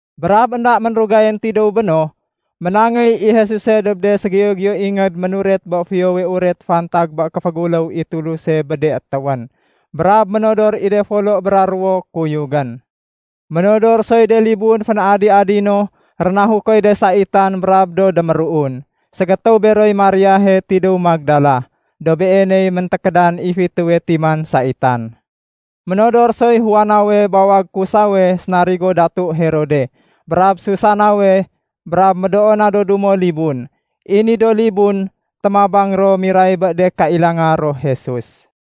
Brab énda ménrugayén tidéw béno, ménangéy i Jesuse dob de ségiyo-giyo ingéd ménuret bé Fiyowe Uret fantag bé kéféguléw i Tuluse bé de étéwén. Brab ménodor i de folo bra ruwo kuyugén. Ménodor soy de libun fén-adi-adi no rénahukoy de saitan brab do déméruun. Ségétéw beroy Mariahe tidéw Magdala, dob beeney méntékédan i fitéwe timan saitan. Ménodor soy Juanawe bawag Kusawe sénarigo Datu Herode, brab Susanawe, brab médoo na do dumo libun. I ni do libun, témabang ro miray bé de kailanga ro Jesus.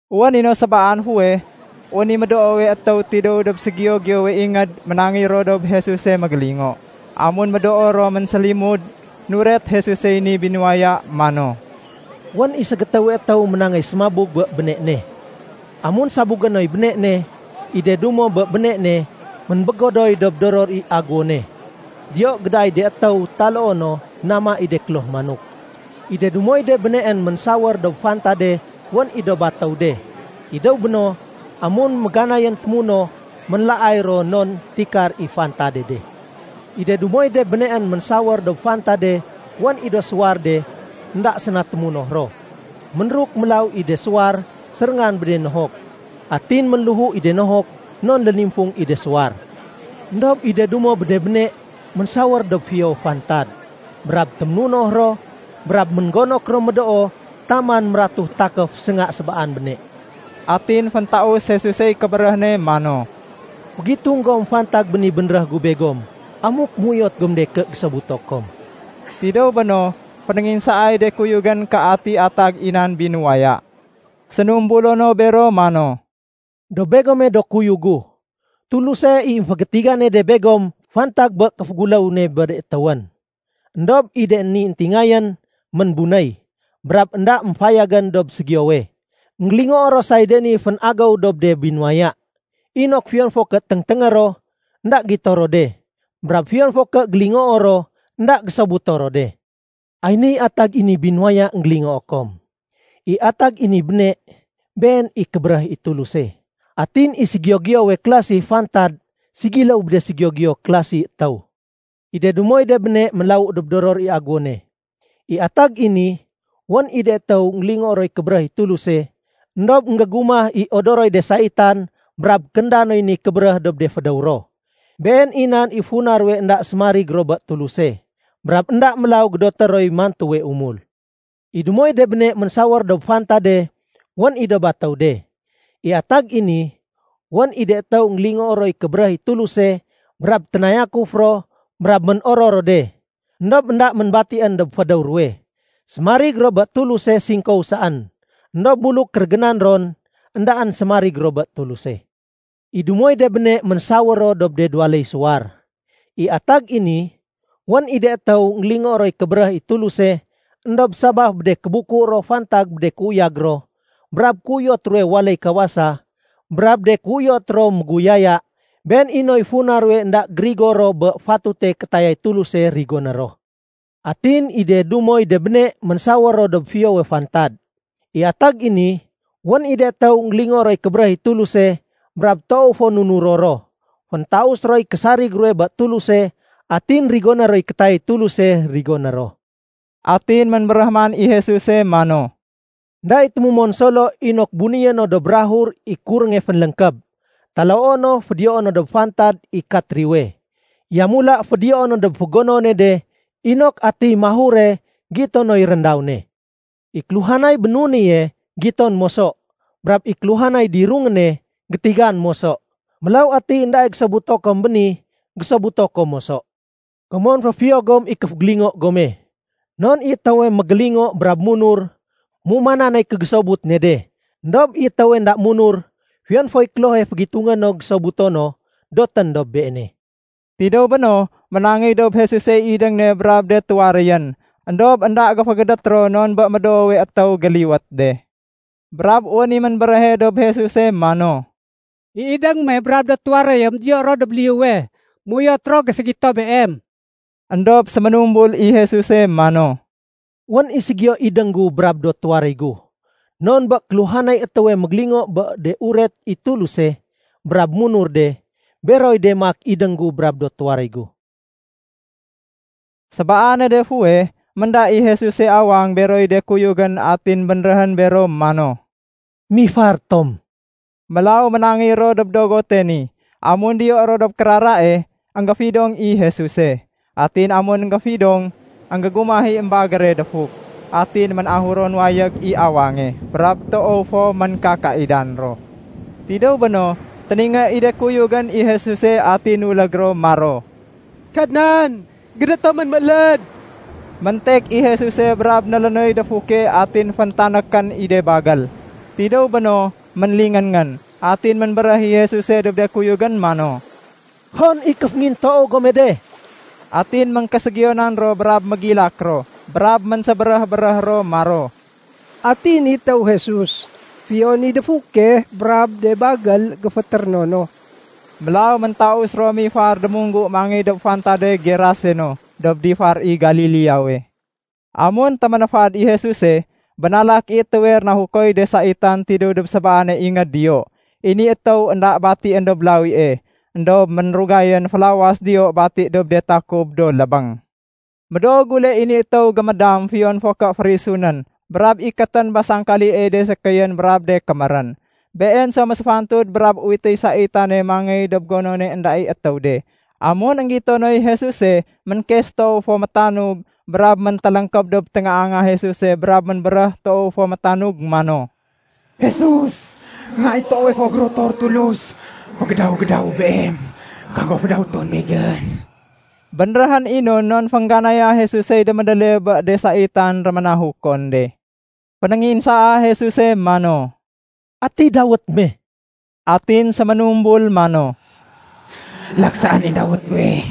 Wén i no sébaan fuweh, wén i médoowe étéw tidéw dob ségiyo-giyowe ingéd ménangéy ro dob Jesuse mégélingo. Amun médoo ro ménsélimud, nuret Jesusey ni binuwaya mano, “Wén i ségétéwe étéw ménangéy sémabug bé béne ne. Amun sabugé noy béne ne, i de dumo bé béne ne ménbégodoy dob doror i aguwone. Diyo gédaay de étéw taloo no nama i de kloh manok. I de dumoy de béneén ménsawér dob fantade wén i do batéw de. Tidéw béno, amun méganayén témunoh, ménlaay ro non tikar i fantade de. I de dumoy de béneén ménsawér dob fantade wén i do suwar de énda séna témunoh ro. Ménruk mélaw i de suwar séréngan bé de nohok, atin ménléhu i de nohok non lénimfung i de suwar. Endob i de dumo bé de béne ménsawér dob fiyowe fantad, brab téménunoh ro brab ménggonok ro médoo taman mératu takéf sénga sébaan béne.” Atin féntaus Jesusey kébéréh ne mano, “Fégitung gom fantag bé ni bénréh gu begom amuk méuyot gom de ké gésobuto kom.” Tidéw béno, fénénginsaay de kuyugén ké ati atag i nan binuwaya. Sénumbulo no bero mano, “Dob begome do kuyug gu, Tuluse i émfégétigane de begom fantag bé kéféguléw ne bé de étéwén. Endob i de ni éntingayén ménbunéy, brab énda émfayagén dob ségiyowe. Enggélingoo ro say de ni fén-agéw dob de binuwaya, inok fiyon fo ké téngténgé ro, énda gito ro de. Brab fiyon fo ké gélingoo ro, énda gésobuto ro de. “Ay niy atag i ni binuwaya énggélingoo kom. I atag i ni béne, been i kébéréh i Tuluse. Atin i ségiyo-giyowe klasi fantad ségiléw bé de ségiyo-giyo klasi étéw. I de dumoy de béne ménlawu dob doror i aguwone. I atag i ni, wén i de étéw énggélingoo roy kébéréh i Tuluse, éndob énggégumah i odoroy de saitan brab kénda noy ni kébéréh dob de fédéw ro. Been i nan i funa ruwe énda sémarig ro bé Tuluse. Brab énda mélaw gédoté roy mantuwe umul. I dumoy de béne ménsawér dob fantade, wén i do batéw de. I atag i ni, wén i de étéw énggélingoo roy kébéréh i Tuluse brab ténayakuf ro brab ménoror ro de. Endob énda ménbatién dob fédéw ruwe. Sémarig ro bé Tuluse singkow saén. Endob buluk kérégénan ron, éndaén sémarig ro bé Tuluse. I dumoy de béne ménsawér ro dob de duwaléy suwar. I atag i ni, wén i de étéw énggélingoo roy kébéréh i Tuluse, éndob sabaf bé de kébuku ro fantag bé de kéuyag ro, brab kéuyot ruwe waléy kawasa, brab de kéuyot ro méguyaya, been i noy funa ruwe énda gérigo ro bé fatute kétayay Tuluse rigoné ro. Atin i de dumoy de béne ménsawér ro dob fiyowe fantad. I atag i ni, wén i de étéw énggélingoo roy kébéréh i Tuluse, brab toow fo nunuro ro. Féntaus roy késarig ruwe bé Tuluse atin rigoné roy kétayay Tuluse rigoné ro.” Atin ménbéréh man i Jesuse mano, “Enda i témumon solo inok bunéyé no dob bukag i kurénge fénléngkéb, taloo no fédiyoé no dob fantad i katriwe. Yamula fédiyoé no dob fégonone de inok atiy mahure gito noy réndaw ne. I kéluhanay bénunéye, giton moso. Brab i kéluhanay dirungéne, gétigan moso. Mélaw atiy éndae gésobuto kom béni, gésobuto kom moso. “Komon féfiyo gom i kéfégélingo gome. Non i étéwe mégélingo brab munur, méumanan nay kégésobut ne de. Endob i étéwe énda munur, fiyon foy klohe fégitungé no gésobuto no, dotén dob beene.” Tidéw béno, ménangéy dob Jesusey idéng ne brab de tuwaréyén, éndob énda géfégédét ro non bé médoowe étéw géliwét de. Brab wén i ménbéréhe dob Jesuse mano, “I idéng me brab de tuwaréyém diyo ro dob liyuwe. Méuyot ro géségito Beem.” Endob séménumbul i Jesuse mano, “Wén i ségiyo idéng gu brab do tuwaréy gu, non bé kéluhanay étéwe mégélingo bé de uret i Tuluse brab munur de, beroy de maak idéng gu brab do tuwaréy gu.” Sébaane de fuweh, ménda i Jesuse awang beroy de kuyugén atin bénréhén bero mano, “Mifar tom.” Mélaw ménangéy ro dob dogote ni. Amun diyo ro dob kérarae, énggéfidong i Jesuse. Atin amun énggéfidong, énggumah i émbagére défuk. Atin ménahuron wayég i awange, brab toow fo ménkakaidan ro. Tidéw béno, téningé i de kuyugén i Jesuse atin nulég ro maro, “Kadnan, gédét tomén mééléd.” Méntek i Jesuse brab nélénoy défuke atin féntanékén i de bagél. Tidéw béno, ménlingén-ngén. Atin ménbéréh i Jesuse dob de kuyugén mano, “Hon i kéféngintoow gome de?” Atin éngkéségiyonan ro brab mégilak ro. Brab ménsébéréh-béréh ro maro, “Ati ni étéw Jesus? Fiyon i défuke brab de bagél géfétéréno no.” Mélaw méntaus ro mifar démunggu mangéy dob fantade Geraseno, dob difar i Galileawe. Amun téménéfad i Jesuse, bénalak i étéwe rénahukoy de saitan tidéw dob sébaane ingéd diyo. I ni étéw énda batién dob lawie, éndob ménrugayén félawas diyo bati dob de takub do lébéng. Médoo gule i ni étéw géméndam fiyon fo ké férisunén brab ikétén bé sangkaliey de sékéyén brab de kémérén. Been so ménséfantud brab uwitéy de saitan mangéy dob gonone énda i étéw de. Amun énggito noy Jesuse, ménkes toow fo métanug, brab méntéléngkéb dob téngaanga Jesuse brab ménbéréh toow fo métanug mano, “Jesus, Nga i toowe fo gérotor Tulus, fégédaw-gédawu Beem. Kago fédawéton begén.” Bénréhén i no non féngganaya Jesusey démédéle bé de saitan réménahukon de. Fénénginsaa Jesuse mano, “Ati dawét me?” Atin séménumbul mano, “Laksaén i dawét guwe.”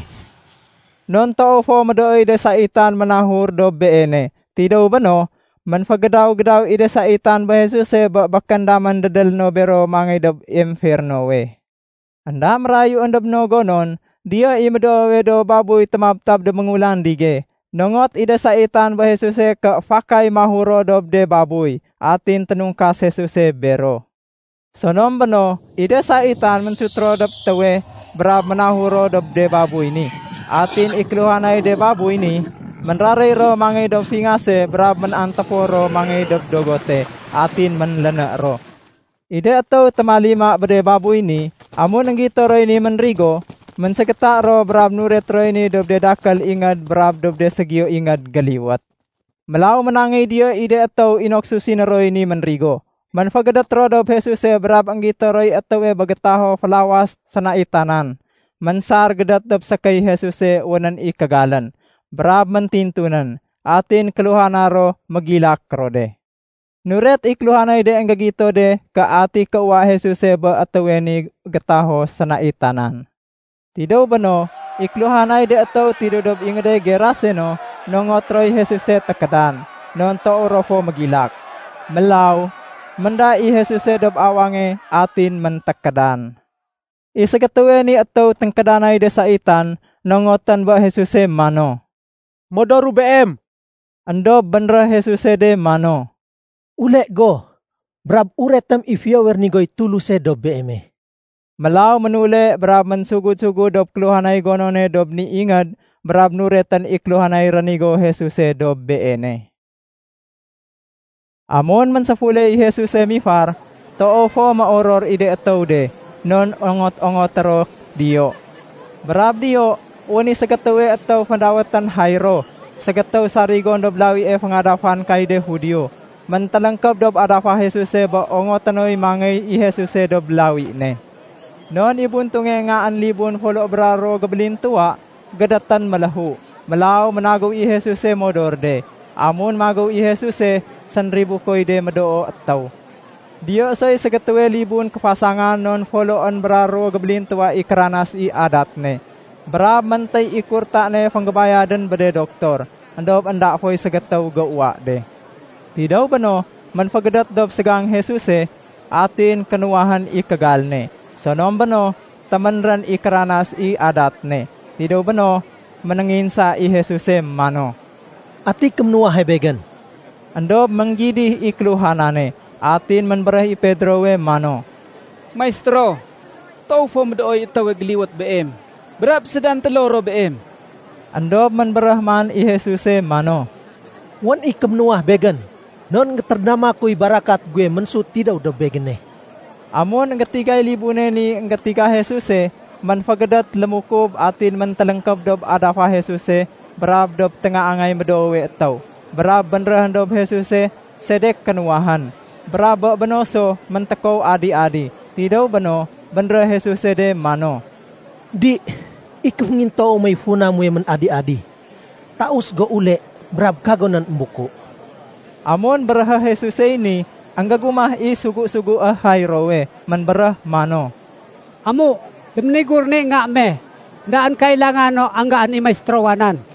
Non toow fo médooy de saitan ménahur dob beene. Tidéw béno, ménfégédaw-gédaw i de saitan bé Jesuse bé békén damén dédélé no bero mangéy dob emfernowe. Enda mérayuén dob no gonon, diyo i médoowe do babuy témabtab dob méngulandige. Nongot i de saitan bé Jesuse ké fakay mahur ro dob de babuy. Atin ténungkas Jesuse bero. Sonom béno, i de saitan ménsut ro dob étéwe brab ménahur ro dob de babuy ni. Atin i kéluhanay de babuy ni, ménraréy ro ménangéy dob fingase brab ménantéfor ro ménangéy dob dogote, atin ménléné ro. I de étéw témalima bé de babuy ni, amun énggito roy ni ménrigo, ménségéta ro brab nuret roy ni dob de dakél ingéd brab dob de ségiyo ingéd géliwét. Mélaw ménangéy diyo i de étéw inok susiné roy ni ménrigo. Ménfégédét ro dob Jesuse brab énggito roy étéwe bé gétaho félawas sénaitanan, ménsar gédét dob sékéy Jesuse wénén i kégalén, brab métintunén. Atin kéluhana ro mégilak ro de. Nuret i kéluhanay de énggégito de ké ati kéuwa Jesuse bé étéwe ni gétaho sénaitanan. Tidéw béno, i kéluhanay de étéw tidéw dob ingéde Geraseno, nongot roy Jesuse tékédan, non toow ro fo mégilak. Mélaw, ménda i Jesuse dob awange, atin méntékédan. I ségétéwe ni étéw ténkédanay de saitan, nongotén bé Jesuse mano, “Modoru Beem.” Endob bénréh Jesuse de mano, “Ule go brab uretém i fiyowe rénigoy Tuluse dob beeme.” Mélaw ménule brab ménsugud-sugud dob kéluhanay gonone dob ni ingéd brab nuretén i kéluhanay rénigo Jesuse dob beene. Amun ménséfule i Jesuse mifar, toow fo méoror i de étéw de, non ongot-ongoté ro diyo. Brab diyo wén i ségétéwe étéw fédawétén Jairo, ségétéw sarigon dob lawie féngadafan kay de Judio. Méntéléngkéb dob adafa Jesuse bé ongoté noy mangéy i Jesuse dob lawi ne. Non i buntunge ngaén libun folo bra ruwo gébélintuwa, gédétén méléhu. Mélaw ménagéw i Jesuse modor de. Amun magéw i Jesuse sénribukoy de médoo étéw. Diyo soy ségétéwe libun kéfasangan non foloén bra ruwo gébélintuwa i kéranas i adat ne. Brab méntéy i kurta ne fénggébayadén bé de doktor, éndob énda foy ségétéw géuwa de. Tidéw béno, ménfégédét dob ségang Jesuse, atin kénuwahén i kégal ne. Sonom béno, téménrén i kéranas i adat ne. Tidéw béno, ménénginsa i Jesuse mano, “Ati kéménuwahe Begén?” Endob ménggidih i kéluhanane. Atin ménbéréh i Pedrowe mano, “Maistéro, toow fo médooy étéwe géliwét Beem, brab sédantélo ro Beem.” Endob ménbéréh man i Jesuse mano, “Wén i kéménuwah Begén, non énggétérédama kuy barakat guwe ménsut tidéw dob Begéne.” Amun énggétigay libune ni énggétiga Jesuse, ménfégédét lémukub atin méntéléngkéb dob adafa Jesuse brab dob téngaangay médoowe étéw, brab bénréhén dob Jesuse sedek kénuwahén, brab bé béno so méntékow adi-adi. Tidéw béno, bénréh Jesuse de mano, “Di, i kéféngintoow mey funa muwe ménadi-adi. Taus go ule, brab kagonén émbuku.” Amun béréhé Jesusey ni, énggégumah i sugu-sugué Jairowe. Ménbéréh mano, “Amu, déménigurén i nga me. Endaén kailanga no anggaén i Maistérowa nan.”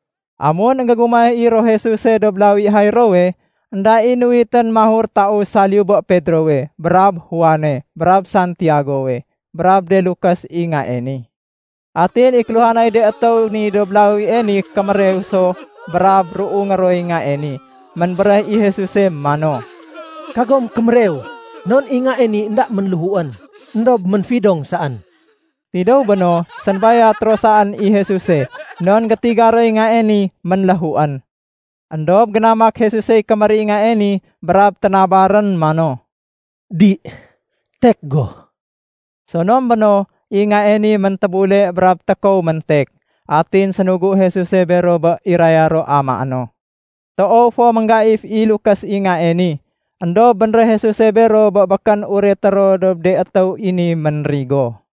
Amun énggégumah i ro Jesuse dob lawi Jairowe, énda i nuwitén mahur taus saliyu bé Pedrowe, brab Juane, brab Santiagowe, brab de lukés i ngae ni. Atin i kéluhanay de étéw ni dob lawie ni kémérew so brab ruungé roy ngae ni. Ménbéréh i Jesuse mano, “Kagom kémérew. Non i ngae ni énda ménléhuén, éndob ménfidong saén.” Tidéw béno, sénbayat ro saén i Jesuse non gétiga roy ngae ni ménléhuén. Endob génamak Jesusey kémér i ngae ni brab ténabarén mano, “Di, tek go!” Sonom béno, i ngae ni méntébule brab tékow méntek. Atin sénugu Jesuse bero bé iraya ro amaé no. Toow fo ménggaif i de lukés i ngae ni. Endob bénréh Jesuse bero bé békén ureté ro dob de étéw i ni ménrigo.